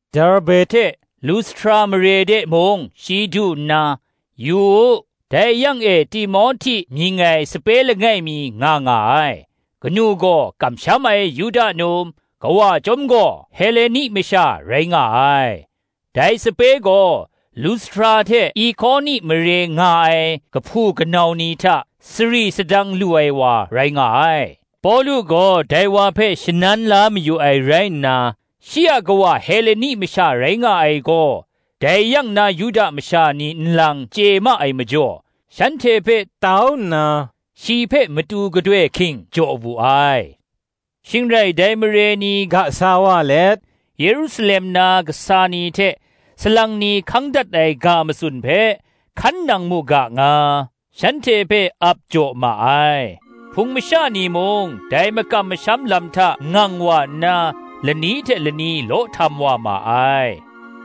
Derbe hte Lustra mare de mung shi du nna, yu u, dai yang e Timohti mying ai sape langai mi nga nga ai; kanu gaw kamsham ai Yuda num, kawa chyawm gaw, Heleni masha rai nga ai. Dai sape gaw, Lustra hte Ikoni mare nga ai kahpu kanau ni hta, sari sadang lu ai wa rai nga ai. Pawlu gaw dai wa hpe shanan la mayu ai rai nna, shi a kawa Heleni masha rai nga ai gaw, dai yang na Yuda masha ni nlang chye ma ai majaw, shanhte hpe tau nna, shi hpe matu gadoi hking jaw wu ai. Shing rai, dai mare ni ga sa wa let, Yerusalem na kasa ni hte salang ni hkang dat ai ga matsun hpe, hkan nang mu ga nga, shanhte hpe ap jaw ma ai. Hpung masha ni mung dai makam masham lam hta ngang wa nna, lani hte lani law htam wa ma ai.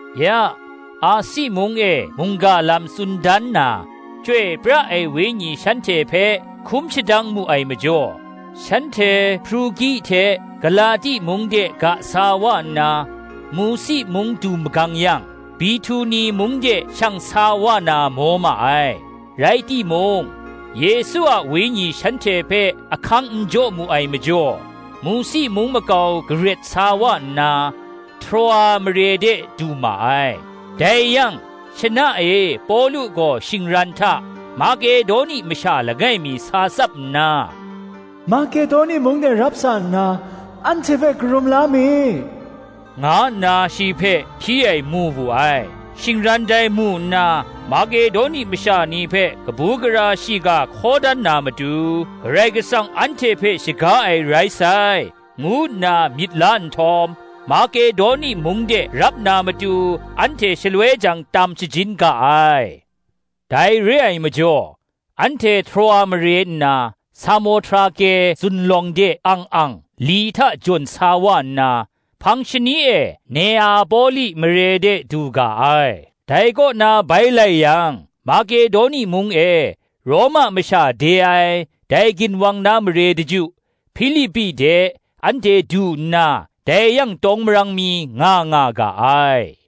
Ya, Asi mung e mungga lam tsun dan na, Chyoi pra ai Wenyi shanhte hpe hkum shadang mu ai majaw, shanhte Hprugi hte Galati mung de ga sa wa nna, Musi mung du magang yang, Bihtuni mung de shang sa wa na maw ma ai; rai timung, Yesu a Wenyi shanhte hpe ahkang n jaw mu ai majaw, Musi mung makau garet sa wa nna, Troa mare de du ma ai. Dai yang, shana e Pawlu gaw shingran hta, Makedoni masha langai mi sa tsap nna, “Makedoni mung de rap sa nna, anhte hpe karum la mi,” nga nna shi hpe hpyi ai mu wu ai. Shingran dai mu nna, Makedoni masha ni hpe kabu gara shiga hkaw dan na matu, Karai Kasang anhte hpe shaga ai rai sai, ngu nna myit la nhtawm, Makedoni mung de rap na matu anhte shaloi jang tam shajin ga ai. Dai re ai majaw, anhte Troa mare nna, Samohtrake zunlawng de ang ang li hta jawn sa wa nna, hpang shani e Neapoli mare de du ga ai; dai kaw na bai lai yang, Makedoni mung e, Roma masha de ai, dai ginwang na mare daju, Hpilipi de, anhte du nna, dai yang tawng marang mi nga nga ga ai.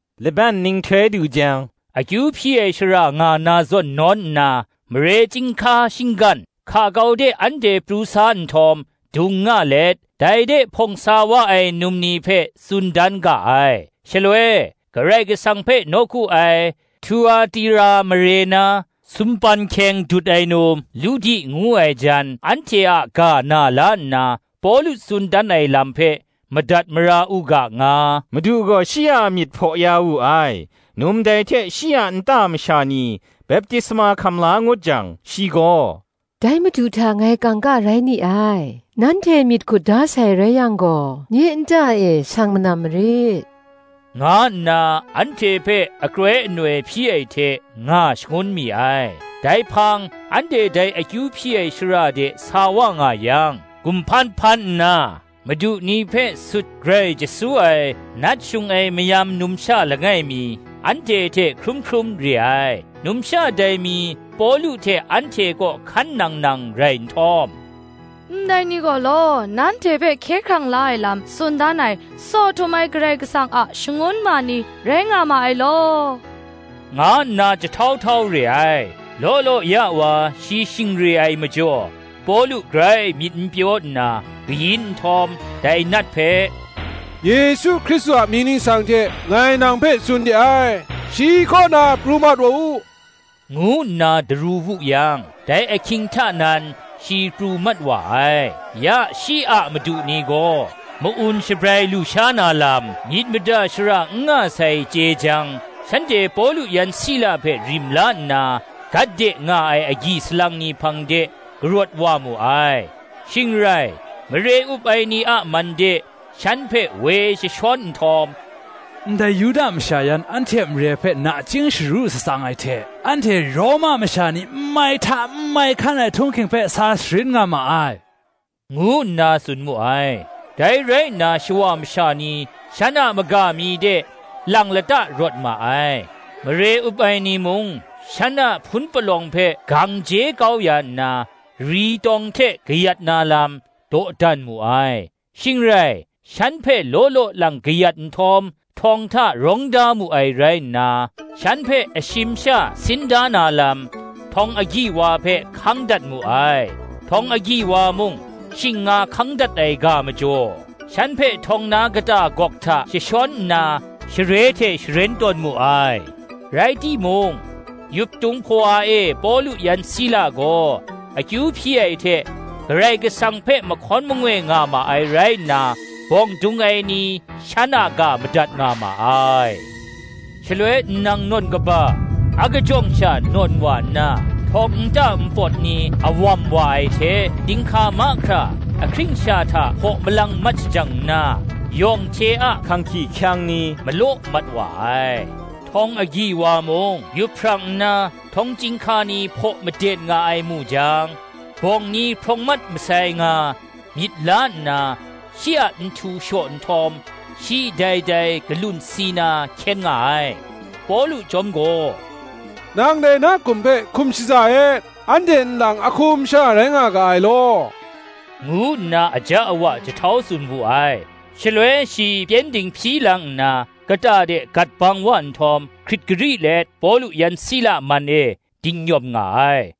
Laban nhtoi du jang, akyu hpyi ai shara nga na zawn nawn nna, mare chyinghka shinggan, hka kau de anhte pru sa nhtawm, dung nga let, dai de hpawng sa wa ai num ni hpe tsun dan ga ai. Shaloi, Karai Kasang hpe nawku ai, Htuatira mare na, sumpan hkyeng dut ai num, Ludi ngu ai jan anhte a ga na la nna, Pawlu tsun dan ai lam hpe madat mara u ga nga, Madu gaw shi a myit hpaw ya wu ai. Num dai hte shi a nta masha ni baptisma hkam la ngut jang, shi gaw, “Dai Madu hta ngai kangka rai ni ai, nanhte myit hkut da sai rai yang gaw, nye nta e shang manam marit,” nga nna anhte hpe akroi anoi hpyi ai hte nga shangun mi ai. Dai hpang anhte dai akyu hpyi ai shara de sa wa nga yang, gumhpan hpan nna, madu ni hpe sut grai jasu ai nat shung ai mayam numsha langai mi anhte hte hkrum hkrum re ai. Numsha dai mi Pawlu hte anhte kaw hkan nang nang rai nhtawm, “Ndai ni gaw law, nanhte hpe hkye hkrang la ai lam tsun dan ai, Tsaw Htum ai Karai Kasang a shangun ma ni rai nga ma ai law,” nga nna jahtau htau re ai. Law law ya wa shi shing re ai majaw, Pawlu grai myit n pyaw nna, kayin nhtawm, dai nat hpe, “Yesu Hkristu a mying ningsang hte ngai nang hpe tsun de ai, shi kaw na pru mat u,” ngu nna daru wu yang, dai ahkying hta nan shi pru mat wa ai. Ya shi a madu ni gaw, ma-un shabrai lu sha na lam myit mada shara n nga sai, chye jang, shanhte Pawlu yan Sila hpe rim la nna, gat de nga ai agyi salang ni hpang de karawt wa mu ai; shing rai, mare up ai ni a man de shan hpe woi jashawn n htawm, “Ndai Yuda masha yan, anhte a mare hpe nachying sharu shatsang ai hte, anhte Roma masha ni n mai hta, n mai hkan ai htung hking hpe sa sharin nga ma ai,” ngu nna tsun mu ai. Dai rai nna shawa masha ni shan a maga mi de lang lata rawt ma ai; mare up ai ni mung, shan a hpun palawng hpe gang je kau ya nna, ri tawng hte kayat na lam, dawdan mu ai. Shing rai, shan hpe law law lang kayat nhtawm, htawng hta rawng da mu ai rai nna, shan hpe ashim sha sin da na lam, htawng agyi wa hpe hkang dat mu ai; htawng agyi wa mung, shing nga hkang dat ai ga majaw, shan hpe htawng na kata gawk hta jashawn nna, share hte sharen tawn mu ai. Rai timung, yuptung hpawa e Pawlu yan Sila gaw akyu hpyi ai hte, Karai Kasang hpe mahkawn mangoi nga ma ai rai nna, bawng dung ai ni shan a ga madat nga ma ai. Shaloi nnang nawn kaba akajawng sha nawn wa nna, htawng nta npawt ni awam wa ai hte, chyinghka mahkra ahkring sha hta hpaw malang mat shajang nna, yawng hte a hkang hkyihkyang ni malaw mat wa ai. Htawng agyi wa mung, yup hprang nna, htawng chyinghka ni hpaw maden nga ai mu jang, bawng ni hprawng mat masai nga, myit la nna, shi a nhtu shaw nhtawm, shi dai dai galun si na hkyen nga ai. Pawlu chyawm gaw, “Nang dai, na hkum hpe hkum shaza et, anhte nlang ahkum sha rai nga ga ai law,” ngu nna aja awa jahtau tsun wu ai. Shaloi shi pyengdin hpyi lang nna, kata de gat bang wa nhtawm, hkrit gari let Pawlu yan Sila man e dingnyawm nga ai;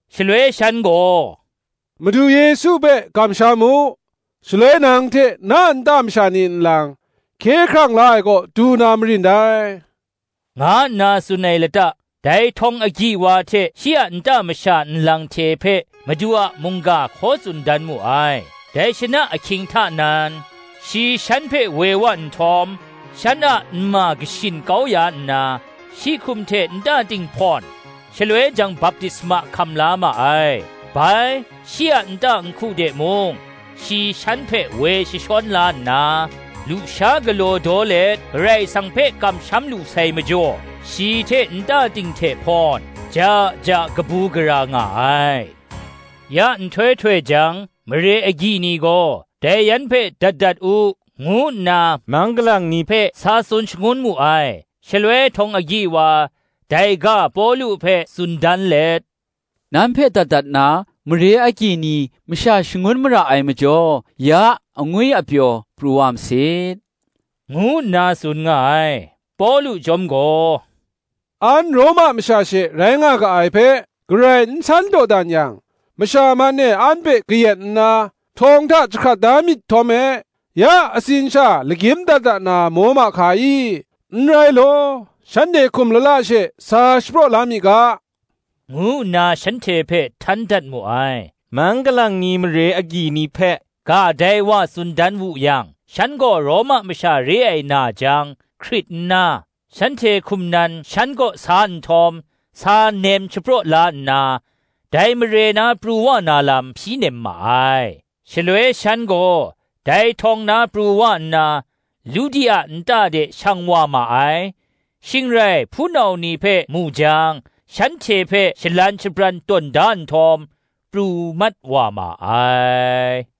Shaloi shan gaw, Madu Yesu hpe kamsham u; shaloi nang hte na nta masha ni nlang, hkye hkrang la ai kaw du na marin dai,” nga nna tsun ai lata, dai htawng agyi wa hte shi a nta masha nlang hte hpe Madu a mungga hkaw tsun dan mu ai. Dai shana ahkying hta nan, shi shan hpe woi wa nhtawm, shan a nma kashin kau ya nna, shi hkum hte nta ting hpawn, shaloi jang baptisma hkam la ma ai. Bai, shi a nta nhku de mung shi shan hpe woi jashawn la nna, lusha galaw daw let, Karai Kasang hpe kamsham lu sai majaw, shi hte nta ting hte hpawn, ja ja kabu gara nga ai. Ya nhtoi htoi jang, mare agyi ni gaw, Dai yan hpe dat dat u, ngu nna mang galang ni hpe sa tsun shangun mu ai. Shaloi htawng agyi wa, dai ga Pawlu hpe tsun dan let, “Nan hpe dat dat na, mare agyi ni masha shangun mara ai majaw, ya angwi apyaw pru wa masit,” ngu nna tsun nga ai. Pawlu chyawm gaw, “An Roma masha she rai nga ga ai hpe, garai n san dawdan yang, masha man e an hpe kayat nna, htawng hta jahkrat da myit htawm me, ya atsin sha lagyim dat dat na maw ma hka i? N rai law, shanhte hkum lala she sa shapraw la mi ga,” ngu nna shanhte hpe htan dat mu ai. Mang galang ni mare agyi ni hpe ga dai wa tsun dan wu yang, shan gaw Roma masha re ai na jang, hkrit nna, shanhte hkum nan shan kaw sa nhtawm, sa nem shapraw la nna, dai mare na pru wa na lam hpyi nem ma ai. Shaloi shan gaw dai htawng na pru wa nna, Ludi a nta de shang wa ma ai; shing rai hpunau ni hpe mu jang, shanhte hpe shalan shabran tawn da nhtawm, pru mat wa ma ai.